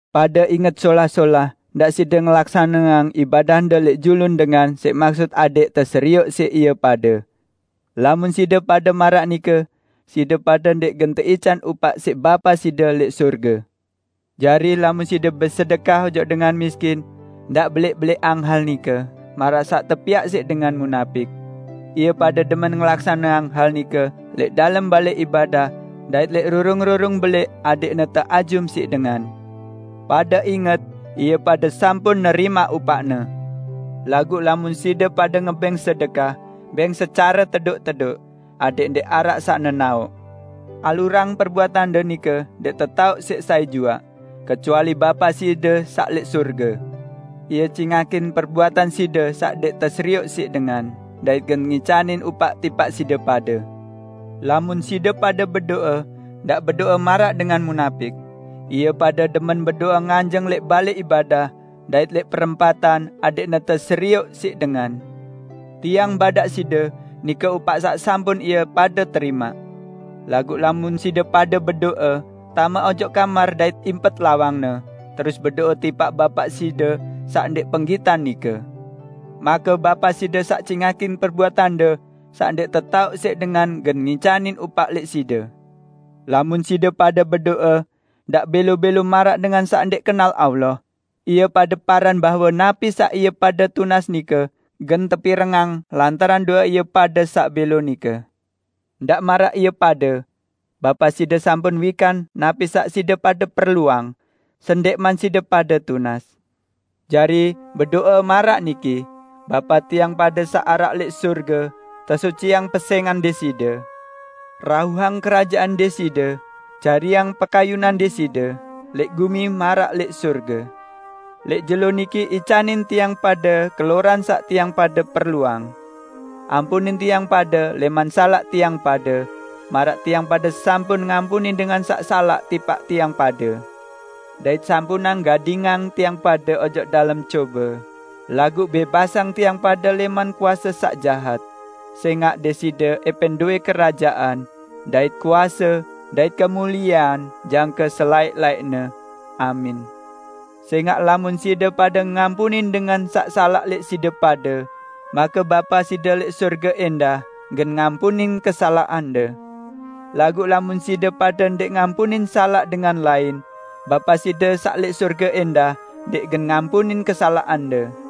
"Pade inget solah-solah, ndaq side ngelaksaneang ibadahde lẽq julun dengan siq maksut adẽq teserioq siq ie pade. Lamun side pade maraq nike, side pade ndẽq gen teican upaq siq Bapa side lẽq sorge. Jari, lamun side besedekah ojok dengan miskin, ndaq belẽq-belẽqang hal nike maraq saq tepiaq siq dengan munapik. Ie pade demen ngelaksaneang hal nike lẽq dalem balẽ ibadah dait lẽq rurung-rurung belẽq adẽqne teajum siq dengan. Pade inget, ie pade sampun nerimaq upaqne. Laguq lamun side pade ngebẽng sedekah, bẽng secare tedoq-tedoq, adẽq ndẽq araq saq nenaoq. Alurang perbuatande nike ndẽq tetaoq siq sai juaq, kecuali Bapa side saq lẽq sorge. Ie cingakin perbuatan side saq ndẽq teserioq siq dengan, dait gen ngicanin upaq tipaq side pade." "Lamun side pade bedo'e, ndaq bedo'e maraq dengan munapik. Ie pade demen bedo'e nganjeng lẽq balẽ ibadah dait lẽq perempatan adẽqne teserioq siq dengan. Tiang badaq side, nike upaq saq sampun ie pade terimaq. Laguq lamun side pade bedo'e, tame ojok kamar dait impet lawangne, terus bedo'e tipaq Bapa side saq ndẽq penggitan nike, make Bapa side saq cingakin perbuatande saq ndẽq tetaoq siq dengan gen ngicanin upaq lẽq side. Lamun side pade bedo'e, ndaq bẽlo-bẽlo maraq dengan saq ndẽq kenal Allah. Ie pade paran bahwe napi saq ie pade tunas nike gen tepirengang lantaran do'e ie pade saq bẽlo nike. Ndaq maraq ie pade. Bapa side sampun wikan napi saq side pade perluang, sendẽqman side pade tunas. Jari, bedo'e maraq niki: 'Bapa tiang pade saq araq lẽq sorge, tesuciang pesẽngan Deside. Rauhang Kerajaan Deside, jariang pekayunan Deside lẽq gumi maraq lẽq sorge. Lẽq jelo niki icanin tiang pade keloran saq tiang pade perluang. Ampunin tiang pade lẽman salaq tiang pade, maraq tiang pade sampun ngampunin dengan saq salaq tipaq tiang pade; dait sampunang gadingang tiang pade ojok dalem cobe, laguq bẽbasang tiang pade lẽman kuase saq jahat. [Sẽngaq Deside ẽpẽn dowẽ Kerajaan dait kuase dait kemuliean jangke selaẽq-laẽqne. Amin.]' Sẽngaq lamun side pade ngampunin dengan saq salaq lẽq side pade, make Bapa side lẽq sorge ẽndah gen ngampunin kesalaqande. Laguq lamun side pade ndẽq ngampunin salaq dengan lain, Bapa side saq lẽq sorge ẽndah ndẽq gen ngampunin kesalaqande."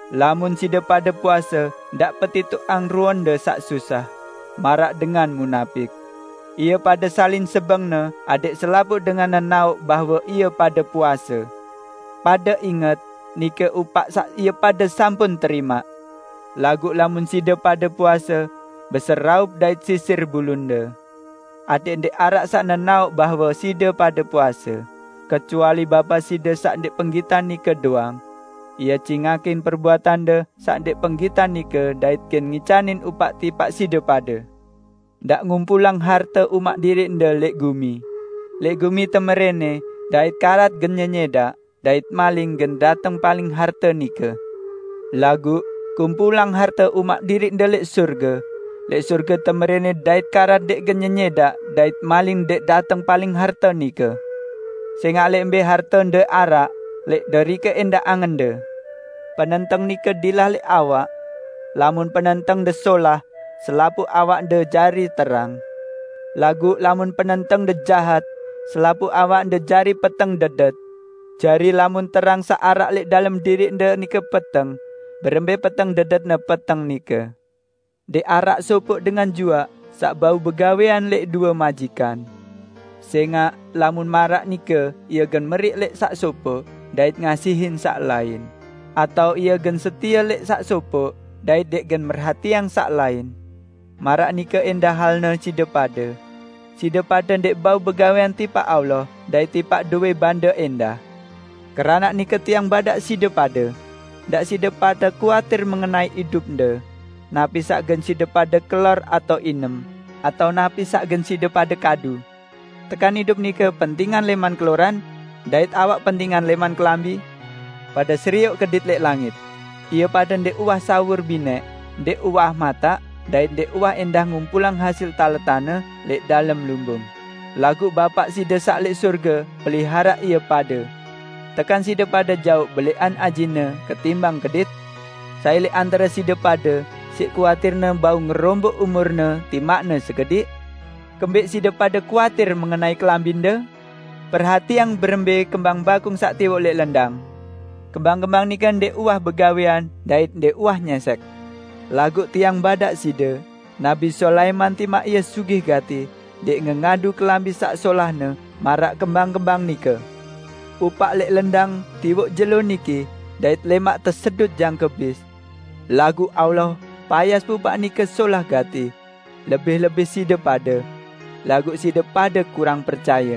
"Lamun side pade puase, ndaq petitoqang ruende saq susah, maraq dengan munapik. Ie pade salin sebengne adẽq selapuq dengan nenaoq bahwe ie pade puase. Pade inget, nike upaq saq ie pade sampun terimaq. Laguq lamun side pade puase, beseraup dait sisir bulunde, adẽq ndẽq araq saq nenaoq bahwe side pade puase, kecuali Bapa side saq ndẽq penggitan nike doang. Ie cingakin perbuatande saq ndẽq penggitan nike dait gen ngicanin upaq tipaq side pade." "Ndaq ngumpulang harte umaq diriqde lẽq gumi; lẽq gumi temerẽnẽ dait karat gen nyenyẽdaq dait maling gen dateng paling harte nike. Laguq, kumpulang harte umaq diriqde lẽq sorge; lẽq sorge temerẽnẽ dait karat ndẽq gen nyenyẽdaq dait maling ndẽq dateng paling harte nike. Sẽngaq lẽq mbẽ hartende araq, lẽq derike ẽndah angende!" "Penenteng nike dilah lẽq awak. Lamun penentengde solah, selapuq awakde jari terang. Laguq lamun penentengde jahat, selapuq awakde jari peteng dedet. Jari lamun terang saq araq lẽq dalem diriqde nike peteng, berembẽ peteng dedetne peteng nike!" "Ndẽq araq sopoq dengan juaq saq bau begawẽan lẽq due majikan. Sẽngaq lamun maraq nike ie gen meriq lẽq saq sopoq dait ngasihin saq lain, atao ie gen setie lẽq saq sopoq dait ndẽq gen merhatiang saq lain. Maraq nike ẽndah halne side pade; side pade ndẽq bau begawẽan tipaq Allah dait tipaq dowẽ bande ẽndah. Keranaq nike Tiang badaq side pade: Ndaq side pade kuatir mengenai idupde, napi saq gen side pade kelor atao inem, atao napi saq gen side pade kadu. Tekan idup nike pentingan lẽman keloran dait awak pentingan lẽman kelambi? Pade serioq kedit lẽq langit. Ie pade ndẽq uwah sawur binẽq, ndẽq uwah mataq dait ndẽq uwah ẽndah ngumpulang hasil taletanne lẽq dalem lumbung, laguq Bapa side saq lẽq sorge peliharaq ie pade. Tekan side pade jaoq belẽqan ajine ketimbang kedit? Sai lẽq antare side pade siq kuatirne bau ngeromboq umurne timaqne sekediq? Kembẽq side pade kuatir mengenai kelambinde? Perhatiang berembẽ kembang bakung saq tiwoq lẽq lendang. Kembang-kembang nike ndẽq uwah begawẽan dait ndẽq uwah nyẽsẽk; laguq Tiang badaq side: Nabi Sulaiman timaq ie sugih gati, ndẽq ngengadu kelambi saq solahne maraq kembang-kembang nike! Pupaq lẽq lendang tiwoq jelo niki dait lẽmaq tesedut jangke bis. Laguq Allah payas pupaq nike solah gati. Lebih-lebih side pade! Laguq side pade kurang percaye!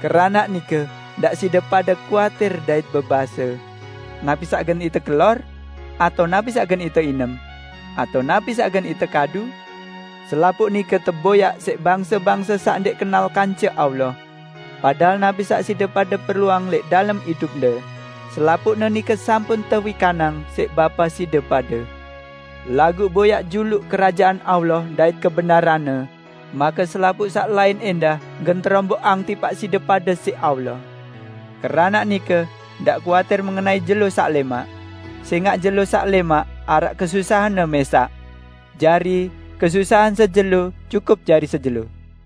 Keranaq nike, ndaq side pade kuatir dait bebase, 'Napi saq gen ite kelor?' atao 'Napi saq gen ite inem?' atao 'Napi saq gen ite kadu?' Selapuq nike teboyaq siq bangse-bangse saq ndẽq kenal kance Allah. Padahal napi saq side pade perluang lẽq dalem idupde, selapuqne nike sampun tewikanang siq Bapa side pade. Laguq boyaq juluq Kerajaan Allah dait kebenaranne, make selapuq saq lain ẽndah gen teromboqang tipaq side pade siq Allah. Keranaq nike, ndaq kuatir mengenai jelo saq lẽmaq. Sẽngaq jelo saq lẽmaq araq kesusahanne mẽsaq. Jari, kesusahan sejelo cukup jari sejelo."